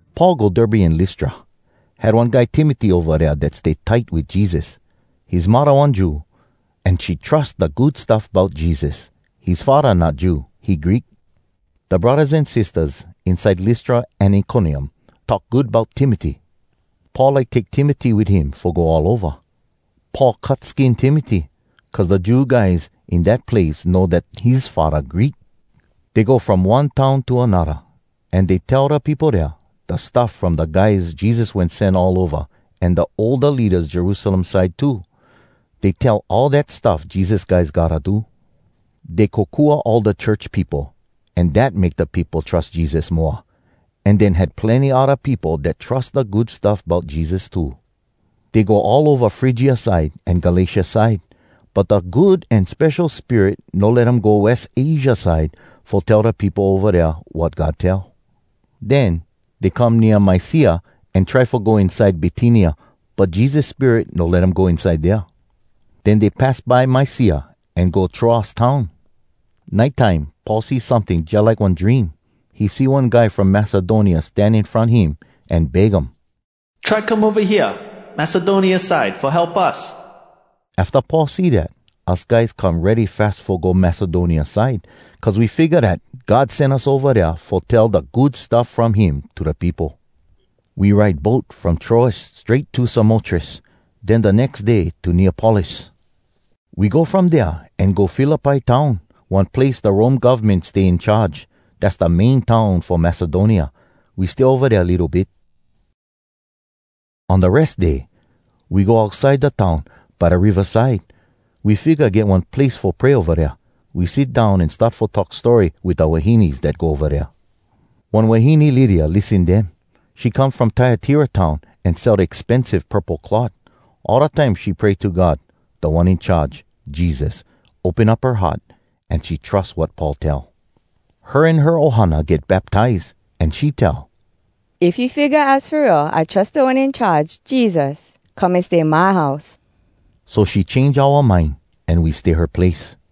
Paul go Derbe an Lystra. Had one guy Timoty ova dea dat stay tight wit Jesus. His muddah one Jew, an she trus da Good Stuff Bout Jesus. His faddah not Jew, he Greek. Da braddahs an sistahs inside Lystra an Iconium talk good bout Timoty. Paul like take Timoty wit him fo go all ova. Paul cut skin Timoty, cuz da Jew guys in dat place know dat his faddah Greek. Dey go from one town to anodda. An dey tell da peopo dea da stuff from da guys Jesus wen sen all ova an da older leadas Jerusalem side too. Dey tell all dat stuff Jesus guys gotta do. Dey kokua all da church peopo an dat make da peopo trus Jesus moa. An den had plenny odda peopo dat trus da Good Stuff Bout Jesus too. Dey go all ova Frygia side an Galatia side. But da Good An Spesho Spirit no let um go West Asia side fo tell da peopo ova dea wat God tell. Den dey come nea Mysia an try fo go inside Bitynia, but Jesus Spirit no let um go inside dea. Den dey pass by Mysia an go Troas town. Nite time Paul see someting jalike one dream. He see one guy from Macedonia stan in front him an beg um, “Try come ova hea Macedonia side fo help us.” Afta Paul see dat, us guys come ready fas fo go Macedonia side, cuz we figga dat God sen us ova dea fo tell da Good Stuff From Him to da peopo. We ride boat from Troas strait to Samotrace. Den da nex day to Neapolis. We go from dea an go Philippi town, one place da Rome govmen stay in charge. Dass da main town fo Macedonia. We stay ova dea litto bit. On da Res Day, we go outside da town by da riva side. We figga get one place fo pray ova dea. We sit down an start fo talk story wit da wahines dat go ova dea. One wahine Lydia lissen dem. She come from Tyatira town an sell da expensive purple cloth. All da time she pray to God. Da One In Charge, Jesus, open up her heart, an she trus wat Paul tell. Her an her ohana get baptize, an she tell, “If you figga az fo real I trus Da One In Charge, Jesus, come an stay my house.” So she change oua mind an we stay her place.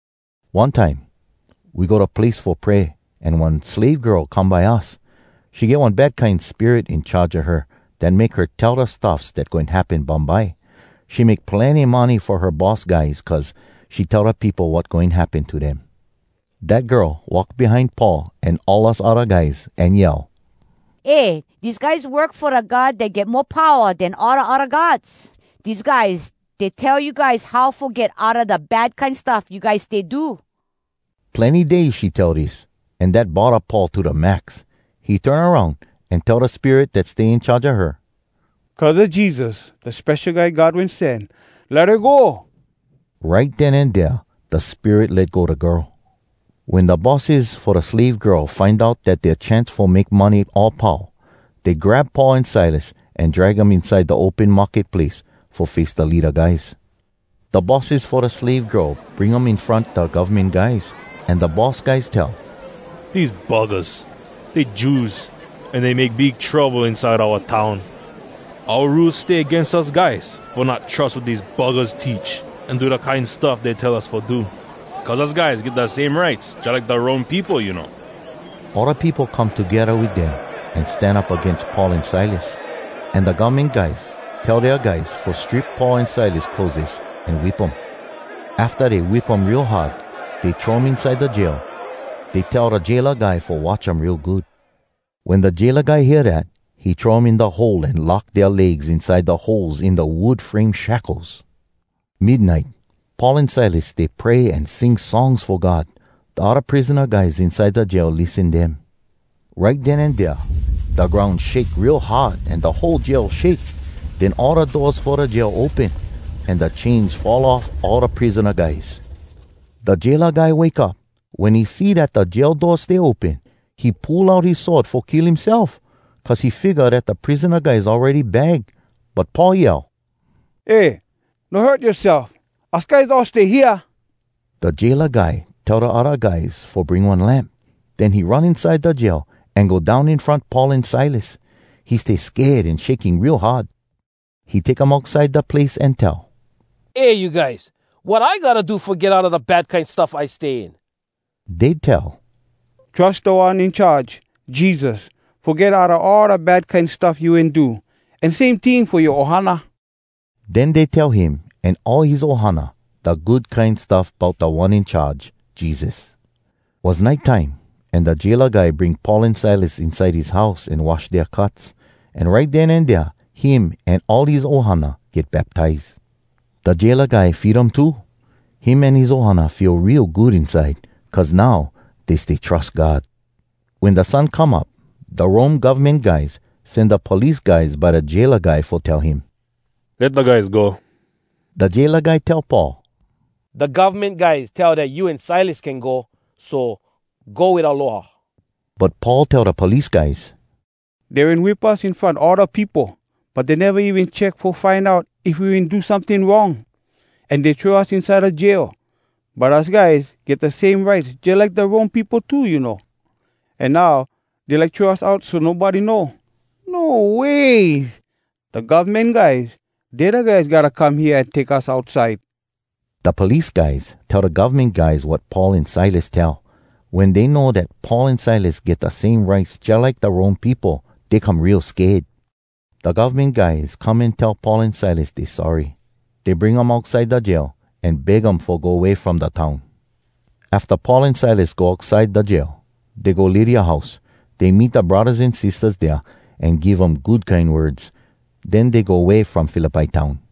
One time we go da place fo pray an one slave girl come by us. She get one bad kine spirit in charge a her dat make her tell da stuffs dat goin happen bumbye. She make plenny money fo her boss guys cuz she tell da peopo wat goin happen to dem. Dat girl walk behind Paul an all us odda guys, an yell, “Eh! Dese guys work fo Da God Dat Get Mo Powa Den All Da Odda Gods. Dese guys, dey tell you guys how fo get outa da bad kine stuff you guys stay do.” Plenny days she tell dis, an dat bodda Paul to da max. He turn aroun an tell da spirit dat stay in charge a her, “Cuz a Jesus, da Spesho Guy God Wen Sen, let her go!” Right den an dea da spirit let go da girl. Wen da bosses fo da slave girl find out dat dea chance fo make money all pau, dey grab Paul an Silas an drag um inside da open market place fo face da leada guys. Da bosses fo da slave girl bring um in front da govmen guys, an da boss guys tell, “Dese buggahs dey Jews an dey make big trouble inside oua town. Oua Rules stay agains us guys fo not trus wat dese buggahs teach an do da kine stuff dey tell us fo do. Cuz us guys get da same rights jalike da Rome peopo, you know.” All da peopo come togedda wit dem an stan up agains Paul an Silas. An da govmen guys tell dea guys fo strip Paul an Silas clotheses an whip um. Afta dey whip um real hard, dey throw um inside da jail. Dey tell da jaila guy fo watch um real good. Wen da jaila guy hear dat, he throw um in da hole an lock dea legs inside da holes in da wood frame shackles. Midnite, Paul an Silas stay pray an sing songs fo God. Da odda prisona guys inside da jail lissen dem. Right den an dea, da groun shake real hard an da whole jail shake. Den all da doors fo da jail open. An da chains fall off all da prisona guys. Da jaila guy wake up. Wen he see dat da jail doors stay open, he pull out his sword fo kill himself, cuz he figga dat da prisona guys awready bag. But Paul yell, “Eh! No hurt yoaself! Us guys all stay hea!” Da jaila guy tell da odda guys fo bring one lamp. Den he run inside da jail an go down in front Paul an Silas. He stay sked an shaking real hard. He take um outside da place an tell, “Eh you guys, wat I gotta do fo get outa da bad kine stuff I stay in?” Dey tell, “Trus Da One In Charge, Jesus, fo get outa all da bad kine stuff you wen do. An same ting fo yoa ohana.” Den dey tell him an all his ohana da Good Kine Stuff bout Da One In Charge, Jesus. Was nite time, an da jaila guy bring Paul an Silas inside his house an wash dea cuts. An right den an dea, him an all his ohana get baptize. Da jaila guy feed um too. Him an his ohana feel real good inside, cuz now dey stay trus God. Wen da sun come up, da Rome govmen guys sen da police guys by da jaila guy fo tell him, “Let da guys go.” Da jaila guy tell Paul, “Da govmen guys tell dat you an Silas can go. So, go wit aloha.” But Paul tell da police guys, “Dey wen whip us in front all da peopo, but dey neva even check fo find out if we wen do someting wrong. An dey throw us inside da jail. But us guys get da same rights jalike da Rome peopo too, you know. An now dey like throw us out so nobody know. No ways! Da govmen guys, dey da guys gotta come hea an take us outside.” Da police guys tell da govmen guys wat Paul an Silas tell. Wen dey know dat Paul an Silas get da same rights jalike da Rome peopo, dey come real sked. Da govmen guys come an tell Paul an Silas dey sorry. Dey bring um outside da jail, an beg um fo go way from da town. Afta Paul an Silas go outside da jail, dey go Lydia house. Dey meet da braddahs an sistahs dea an give um good kine words. Den dey go way from Philippi town.